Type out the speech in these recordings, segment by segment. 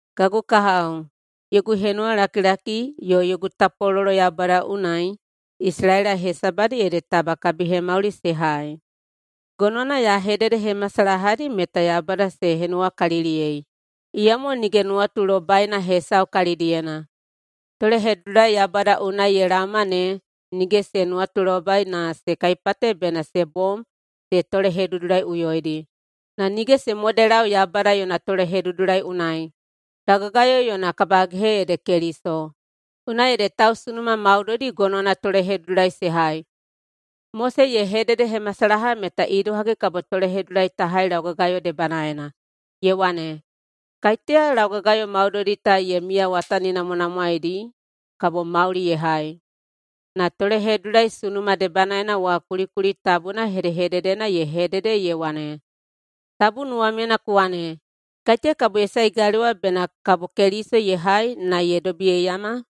Kagu kahao, yogu henuwalakilaki yo yogu tapwalolo Yaubada unai Isalaela hesabadi ede taba kabihemauli se hai. Gonowana ya hededehemasalahadi meta Yaubada se henuwakaliliyei, iyamo nige nuwatulobaina hesau kalidiyena. Tolehedudulai Yaubada unai ye laoma ne nige se nuwatulobai na se kaipate bena se bom se tolehedudulaiꞌuyoidi, na nige se modelau Yaubada yona tolehedudulai unai. Laugagayo yona kabagehe ede Keliso. Unai ede tausunuma maudoidi gonowana tolehedudulai se hai. Mose ye hededehemasalaha meta idohagi kabo tolehedudulai ta hai laugagayo debanaena, ye wane, “Kaiteya laugagayo maudoidi ta ye miyawataninamwanamwaeidi kabo mauli ye hai.” Na tolehedudulai sunuma debanaena wa kulikuli tabuna hedehededena ye hedede ye wane, “Tabu nuwamyena ku wane, ‘Kaiteya kabo ye sae galewa’” bena kabo Keliso ye hai na ye dobiyeiyama?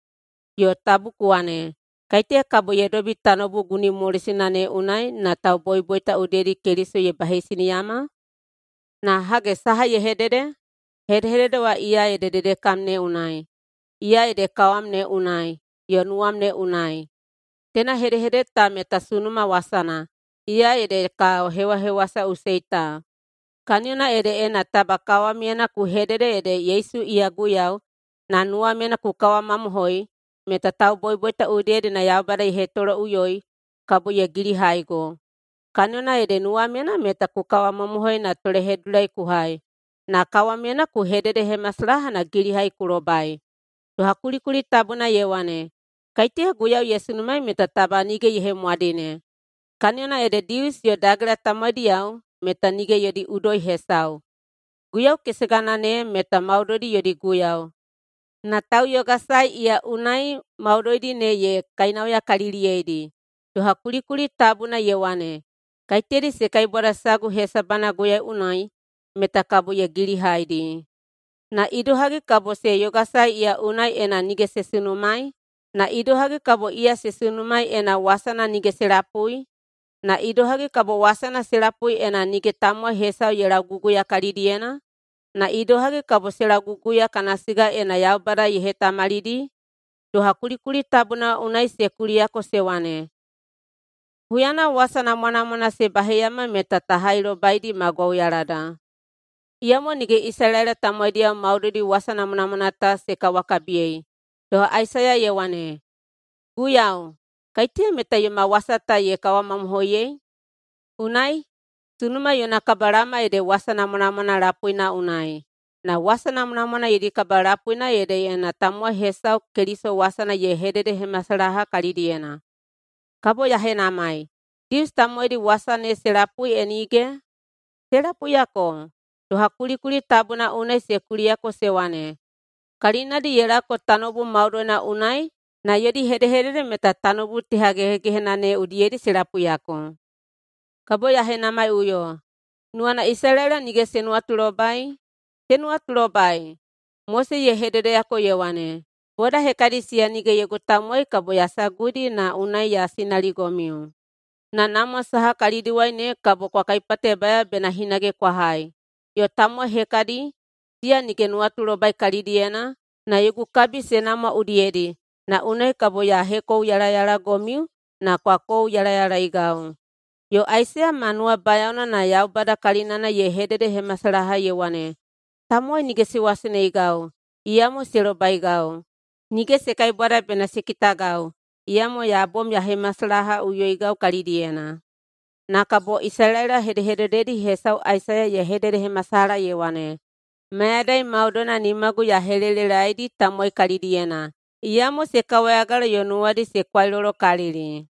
Yo, “tabu ku wane, ‘Kaiteya kabo ye dobi tanoubu gunimolosina ne unai’” na tauboiboita udiyedi Keliso ye baheisiniyama? Na hage, saha ye hedede? “Hedehedede wa iya ede dedekam ne unai. Iya ede kawam ne unai yo nuwam ne unai.” Teina hedehedede ta meta sunuma wasana, iya ede ka hewahewasaꞌusei ta. Kaniyona ede, ena taba kawamyena ku hedede ede Yesu iya Guiyau, na nuwamyena ku kawamamohoi meta tauboiboita udiyedi na Yaubada ye hetoloꞌuyoi, kabo ye gilihaigo. Kaniyona ede nuwamyena meta ku kawamamohoi na tolehedudulai ku hai, na kawamyena ku hededehemasalaha na gilihai ku lobai. Doha kulikuli tabuna ye wane, “Kaiteya Guiyau ye sunumaei meta taba nige ye hemwadine.” Kaniyona ede Dius yo Dagela tamowaidiyao meta nige yodi udoi hesau. Guiyau kesegana ne meta maudoidi yodi Guiyau, na tauyogasae iya unai maudoidi ne ye kainauyakaliliyeidi. Doha kulikuli tabuna ye wane, “Kaiteyadi se kaibwada sagu hesabana Guiyau unai meta kabo ye gilihaidi.” Na idohagi kabo se yogasae iya unai ena nige se sunumaei? Na idohagi kabo iya se sunumaei ena wasana nige se lapui? Na idohagi kabo wasana se lapui ena nige tamowai hesau ye lauguguya kalidiyena? Na idohagi kabo se lauguguya kana siga ena Yaubada ye hetamalidi? Doha kulikuli tabuna unai se kuliyako se wane, “Huyana wasa namwanamwana se baheiyama meta ta hailobaidi ma gwauyalada.” Iyamo nige Isalaela tamowaidiyao maudoidi wasa namwanamwana ta se kawakabiyei. Doha Aisaiya ye wane, “Guiyau, kaiteya meta yoma wasa ta ye kawamamohoiyei?” Unai, sunuma yona kabalaoma ede wasa namwanamwana lapuina unai, na wasa namwanamwana yodi kabalapuina ede ena tamowai hesau Keliso wasana ye hededehemasalaha kalidiyena. Kabo ya henamai, Dius tamowaidi wasa ne se lapui e nige? Se lapuiyako! Doha kulikuli tabuna unai se kuliyako se wane, “Kalinadi ye laoko tanoubu maudoina unai na yodi hedehedede meta tanoubu tehagehegehena ne udiyedi se lapuiyako.” Kabo ya henamaiꞌuyo, nuwana Isalaela nige se nuwatulobai? Se nuwatulobai! Mose ye hededeyako ye wane, “Boda hekadi siya nige yogu tamowai kabo ya saguidi na unai ya sinaligomiu, na namwa saha kalidiwai ne kabo kwa kaipatebayao bena hinage kwa hai, yo tamowai hekadi, siya nige nuwatulobai kalidiyena, na yogu kabi se namwa udiyedi na unai kabo ya hekouyalayalagomiu na kwa kouyalayalaeigau.” Yo Aisaiya ma nuwabayaona na [Yaubada kalinana] ye hededehemasalaha ye wane, “Tamowai nige se waseneigau, iyamo se lobaigau. Nige se kaibwada bena se kitagau, iyamo ya bom ya hemasalahaꞌuyoigau kalidiyena.” Na kabo Isalaela hedehedededi hesau Aisaiya ye hededehemasalaha ye wane, “Mayadai maudoina nimagu ya helelelaedi tamowai kalidiyena, iyamo se kawayagala yo nuwadi se kwailolokalili.”